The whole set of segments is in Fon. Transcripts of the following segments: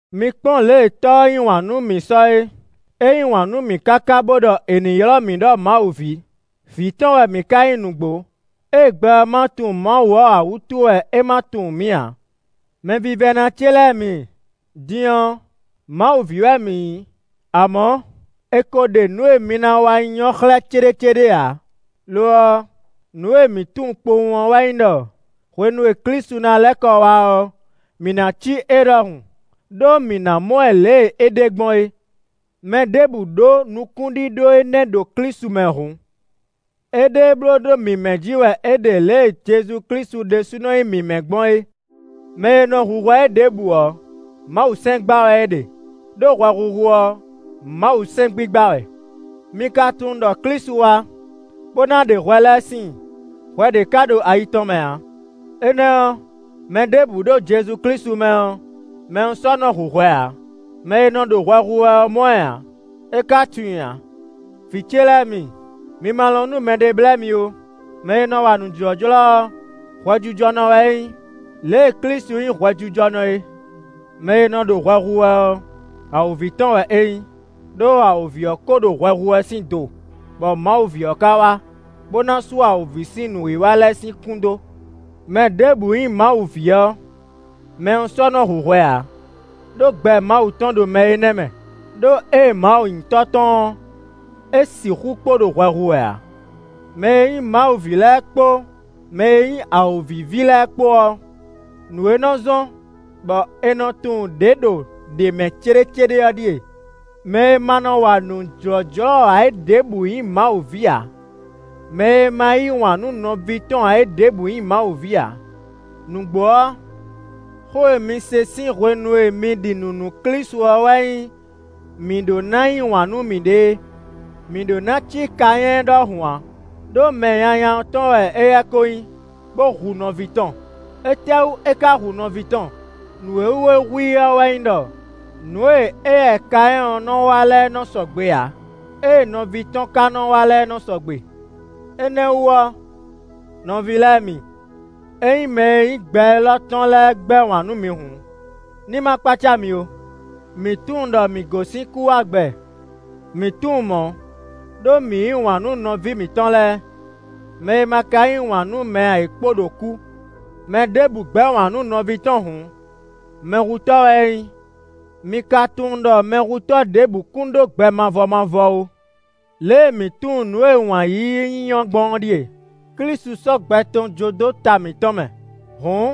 Mi Kpɔ́n lě e Tɔ́ ɔ́ yí wǎn nú mǐ sɔ é. É yí wǎn nú mǐ káká bo ɖɔ è ní ylɔ́ mǐ ɖɔ Mawu ví; vǐ tɔn wɛ mǐ ka nyí nǔgbó. Ée gbɛ ɔ́ ma tunwun Mawu ɔ́ ǎ wútu wɛ é ma tunwun mǐ ǎ. Mɛvívɛ́ná ce lɛ́ɛ mi, din ɔ́, Mawu ví wɛ mǐ nyí; amɔ̌, è ko ɖe nǔ e mi ná wá nyí ɔ́ xlɛ́ céɖécéɖé ǎ. Lo ɔ́, nǔ e mǐ tunwun kpowun ɔ́ wɛ nyí ɖɔ hwenu e Klísu ná lɛ́ kɔ wá ɔ́, mǐ ná cí é ɖɔhun; ɖó mǐ ná mɔ ɛ lě e é ɖe gbɔn é. Mɛ ɖěbǔ ɖó nukún ɖíɖó énɛ́ ɖo Klísu mɛ hǔn, éɖée bló ɖó mǐmɛ́ jí wɛ é ɖe lě e Jezu Klísu ɖésúnɔ nyí mǐmɛ́ gbɔn é. Mɛ e nɔ hu hwɛ é ɖěbǔ ɔ́, Mawusɛ́n gba wɛ é ɖe; ɖó hwɛhuhu ɔ́, Mawusɛ́n gbigba wɛ. Mi ka tunwun ɖɔ Klísu wá, bó ná ɖe hwɛ lɛ́ɛ síin; hwɛ ɖě ka ɖo ayi tɔn mɛ ǎ. Énɛ́ ɔ́, mɛ ɖěbǔ ɖo Jezu Klísu mɛ ɔ́, mɛ ɔ́ sɔ́ nɔ hu hwɛ ǎ; mɛ e nɔ ɖo hwɛ hu wɛ ɔ́ mɔ ɛ ǎ, é ka tunwun i ǎ. Vǐ ce lɛ́ɛ mi, mi ma lɔn nú mɛɖé blɛ́ mi ó; mɛ e nɔ wa nǔ jlɔ́jlɔ́ ɔ́, hwɛjijɔnɔ wɛ é nyí, lě e Klísu nyí hwɛjijɔnɔ é. Mɛ e nɔ ɖo hwɛ hu wɛ ɔ́, awǒvi tɔn wɛ é nyí, ɖó awǒvi ɔ́ ko ɖo hwɛ hu wɛ sín do, bɔ Mawu ví ɔ́ ka wá, bó ná sú awǒvi sín nǔwiwa lɛ́ɛ sín kún dó. Mɛ ɖěbǔ nyí Mawu ví ɔ́, mɛ ɔ́ sɔ́ nɔ hu hwɛ ǎ, ɖó gbɛ Mawu tɔn ɖo mɛ énɛ́ mɛ. Đó ée Mawu nyí Tɔ́ tɔn ɔ́, é sixú kpo ɖo hwɛ hu wɛ ǎ. Mɛ e nyí Mawu ví lɛ́ɛ kpó mɛ e nyí awǒvi ví lɛ́ɛ kpó ɔ́, nǔ e nɔ zɔ́n bɔ è nɔ tunwun ɖě ɖo ɖě mɛ céɖécéɖé ɔ́ ɖíe: mɛ e ma nɔ wa nǔ jlɔ́jlɔ́ ǎ é ɖěbǔ nyí Mawu ví ǎ; mɛ e ma yí wǎn nú nɔví tɔn ǎ é ɖěbǔ nyí Mawu ví ǎ. Nǔgbó ɔ́, xó e mi se sín hwenu e mi ɖi nǔ nú Klísu ɔ́ wɛ nyí mǐ ɖó ná yí wǎn nú mǐɖée. Mǐ ɖó ná cí Kanyɛ́ɛ ɖɔhun ǎ, ɖó mɛ nyanya ɔ́ tɔn wɛ éyɛ́ ko nyí, bó hu nɔví tɔn. Étɛ́wú é ka hu nɔví tɔn? Nǔ e wú é hu i ɔ́ wɛ nyí ɖɔ nǔ e éyɛ́ Kanyɛ́ɛ ɔ́ nɔ wa lɛ́ɛ nɔ sɔgbe ǎ; ée nɔví tɔn ka nɔ wa lɛ́ɛ nɔ sɔgbe. Énɛ́ wú ɔ́ nɔví lɛ́ɛ mi, ényí mɛ e nyí gbɛ élɔ́ tɔn lɛ́ɛ gbɛ́ wǎn nú mi hǔn, ní ma kpácá mi ó. Mǐ tunwun ɖɔ mǐ gosín kú wá gbɛ; mǐ tunwun mɔ̌, ɖó mǐ yí wǎn nú nɔví mǐtɔn lɛ́ɛ. Mɛ e ma ka yí wǎn nú mɛ ǎ é kpo ɖo kú. Mɛ ɖěbǔ gbɛ́ wǎn nú nɔví tɔn hǔn, mɛhutɔ́ wɛ é nyí; mi ka tunwun ɖɔ mɛhutɔ́ ɖěbǔ kún ɖó gbɛ mavɔ mavɔ ó. Lě e mǐ tunwun nǔ e wǎn yíyí nyí ɔ́ gbɔn ɔ́ ɖíe: Klísu sɔ́ gbɛ tɔn jó dó ta mǐtɔn mɛ; hǔn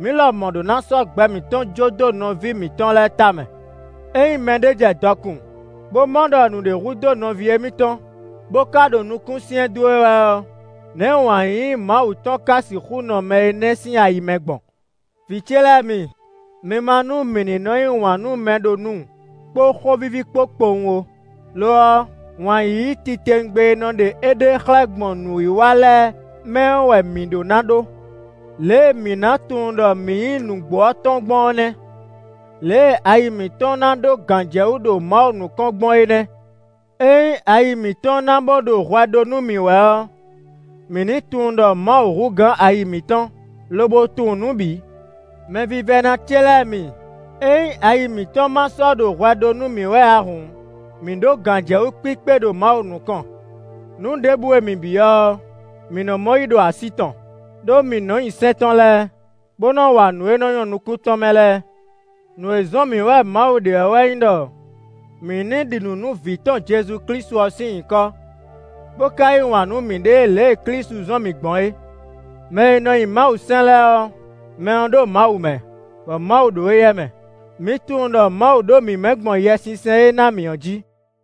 mǐ lɔmɔ̌ ɖó ná sɔ́ gbɛ mǐtɔn jó dó nɔví mǐtɔn lɛ́ɛ tamɛ. Ényí mɛɖé jɛ dɔkun, bó mɔ ɖɔ nǔɖé hudó nɔví émítɔn, bó ka ɖo nukún syɛ́n dó e wɛ ɔ́, nɛ̌ wǎn yíyí Mawu tɔn ka sixú nɔ mɛ énɛ́ sín ayi mɛ gbɔn? Vǐ ce lɛ́ɛ mi, mi ma nú mǐ ní nɔ́ yí wǎn nú mɛ ɖo nu kpó xó víví kpó kpowun ó; lo ɔ́, wǎn yíyí titewungbe e nɔ ɖe éɖée xlɛ́ gbɔn nǔwiwa lɛ́ɛ mɛ ɔ́ wɛ mǐ ɖó ná ɖó. Lě e mǐ ná tunwun ɖɔ mǐ nyí nǔgbó ɔ́ tɔn gbɔn ɔ́ nɛ́; lě e ayi mǐtɔn ná ɖó gǎnjɛwú ɖo Mawu nukɔn gbɔn é nɛ́. Ényí ayi mǐtɔn ná bó ɖo hwɛ ɖó nú mǐ wɛ ɔ́, mǐ ní tunwun ɖɔ Mawu hú gǎn ayi mǐtɔn, lobo tunwun nǔ bǐ. Mɛvívɛ́ná ce lɛ́ɛ mi, ényí ayi mǐtɔn ma sɔ́ ɖo hwɛ ɖó nú mǐ wɛ ǎ hǔn, mǐ ɖó gǎnjɛwú kpíkpé ɖo Mawu nukɔn. Nǔ ɖěbǔ e mǐ byɔ́ ɔ́, mǐ nɔ mɔ yí ɖo así tɔn, ɖó mǐ nɔ nyi sɛ́n tɔn lɛ́ɛ, bó nɔ wa nǔ e nɔ nyɔ́ nukún tɔn mɛ lɛ́ɛ. Nǔ e zɔ́n mǐ wɛ Mawu ɖe ɔ́ wɛ nyí ɖɔ mǐ ní ɖi nǔ nú vǐ tɔn Jezu Klísu ɔ́ sín nyǐkɔ, bó ka yí wǎn nú mǐɖée lě e Klísu zɔ́n mǐ gbɔn é. Mɛ e nɔ nyi Mawusɛ́n lɛ́ɛ ɔ́, mɛ ɔ́ ɖo Mawu mɛ, bɔ Mawu ɖo éyɛ́ mɛ. Mǐ tunwun ɖɔ Mawu ɖo mǐ mɛ gbɔn Yɛsinsɛn e é ná mǐ é jí.